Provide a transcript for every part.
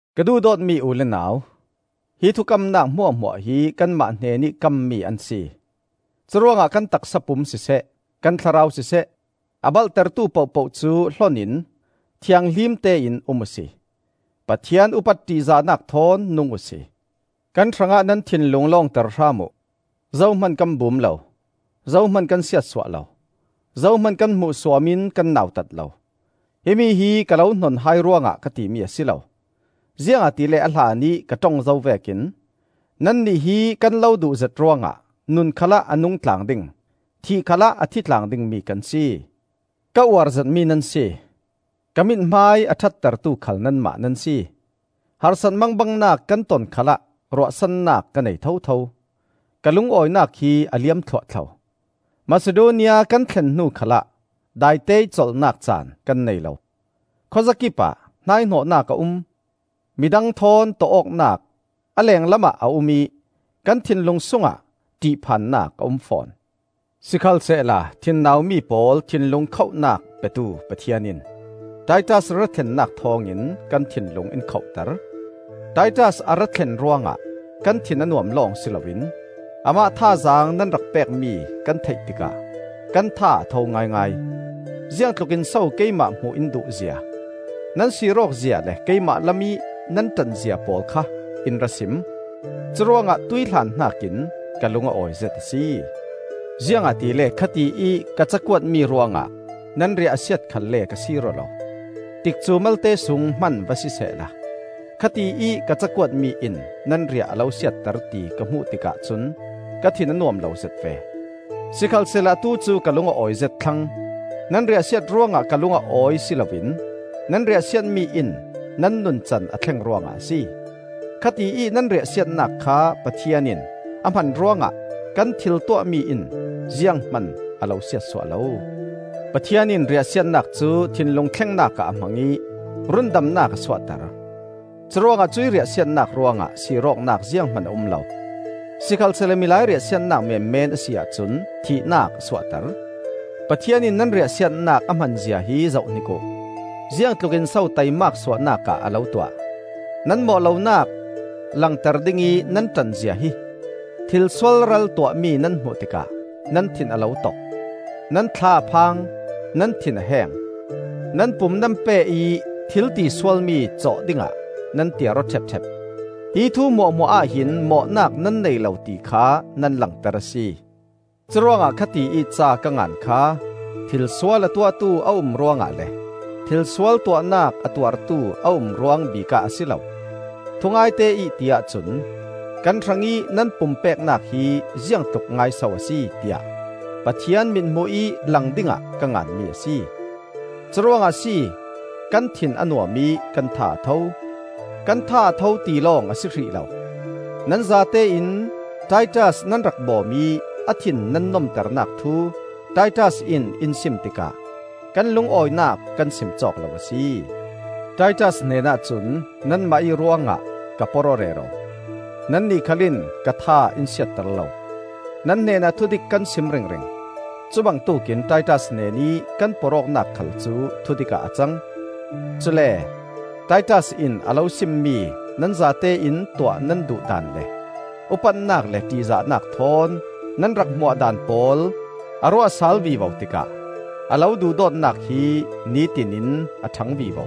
Ka duhdawtmi u le nau, hi thukamnak hmuahhmuah hi kanmah hnenih kammi an si. Curuangah kan taksa pum siseh, kan thlarau siseh a balhtertu pohpoh cu hlon in thianghlim tein um uhsi; Pathian upat ṭihzahnak thawn nung uhsi. Kan hrangah nan thinlung lawngter hram uh. Zohman kan bum lo, zohman kan siatsuah lo, zohman kan hmuhsuam in kan nautat lo. Himi hi ka lo hnon hai ruangah ka timi a si lo; ziangahtile a hlanih ka ṭong zo vekin nannih hi kan lo duhzet ruangah nun khalah a nung tlang ding, thih khalah a thi tlang dingmi kan si. Ka uar zetmi nan si. Ka mithmai a ṭhattertu khal nanmah nan si. Harsat mangbangnak kan ton khalah ruahsannak ka nei thotho. Ka lungawinak hi a liam thluahthlo! Masidonia kan thlen hnu khalah daiteih colhnak caan kan nei lo. Khawzakip ah hnaihnawhnak a um: midang thawn tawh awknak a lenglamah a um ih kan thinlung sungah ṭihphannak a um fawn. Sikhalsehla thinnaumi pawl thinlung khohnak petu Pathian in Titas ra thlennak thawngin kan thinlung in khohter. Titas a ra thlen ruangah kan thin a nuam lawng si loin amah thazaang nan rak pekmi kan theih tikah kan tha a tho ngaingai. Ziangtluk in so keimah hmuh in duhzia, nan sir awkzia le keimah lamih nan ṭanzia pawl kha in ra sim; curuangah tuihhlan hnakin ka lung a awizet a si. Ziangahtile khati ih ka cakuatmi ruangah nan riah a siat khalle ka sir aw lo. Tikcu malte sung hman va sisehla, khati ih ka cakuatmi in nan riah a lo siatter ti ka hmuh tikah cun ka thin a nuam lozet ve. Sikhalsehla atu cu ka lung a awizet thlang; nan riahsiat ruangah ka lung a awi si loin nan riahsiatmi in nan nuncan a thleng ruangah a si. Khati ih nan riahsiatnak kha Pathian in a hman ruangah kan thil tuahmi in zianghman a lo siatsuah lo. Pathian in riahsiatnak cu thinlung thlengnak ah a hmang ih rundamnak a suahter. Curuangah cuih riahsiatnak ruangah sir awknak zianghman a um lo. Sikhalsehla milai riahsiatnak menmen a si ahcun thihnak a suahter. Pathian in nan riahsiatnak a hmanzia hi zohhnik uh: ziangtlukin so taimak suahnak ah a lo tuah; nan mawh lonak langter dingih nan ṭanzia hi! Thil sualral tuahmi nan hmuh tikah nan thin a lo tok, nan thla a phang, nan thin a heng, nan pum nan pe ih thil tisualmi cawh dingah nan tiar aw ṭhepṭhep. Hi thu hmuahhmuah ahhin mawhnak nan nei lo ti kha nan langter a si. Curuangah khati ih ca ka ngan kha thilsual a tuahtu a um ruangah le thilsual tuahnak a tuartu a um ruang bikah a si lo. Thungaite ih ti ahcun kan hrangih nan pumpeknak hi ziangtluk ngaiso a si, tiah Pathian mithmuh ih lang dingah ka nganmi a si. Curuangah a si kan thin a nuam ih kan tha a tho. Kan tha a tho ti lawng a si hrih lo. Nan zatein Titas nan rak bawm ih a thin nan nomternak thu Titas in in sim tikah kan lungawinak kan sim cawk lo a si. Titas hnenah cun nanmah ih ruangah ka porh aw rero. Nannih khal in ka tha in siatter lo. Nan hnenah thudik kan sim ringring; cubangtuk in Titas hnenih kan porh awknak khal cu thudik ah a cang. Cule Titas in a lo simmi nan zatein tuah nan duh daan le upatnak le ṭihzahnak thawn nan rak hmuah daan pawl a ruahsal vivo tikah a lo duhdawtnak hi nitin in a ṭhang vivo.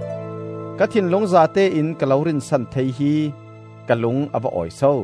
Ka thinlung zatein ka lo rinsan thei hi ka lung a va awi so!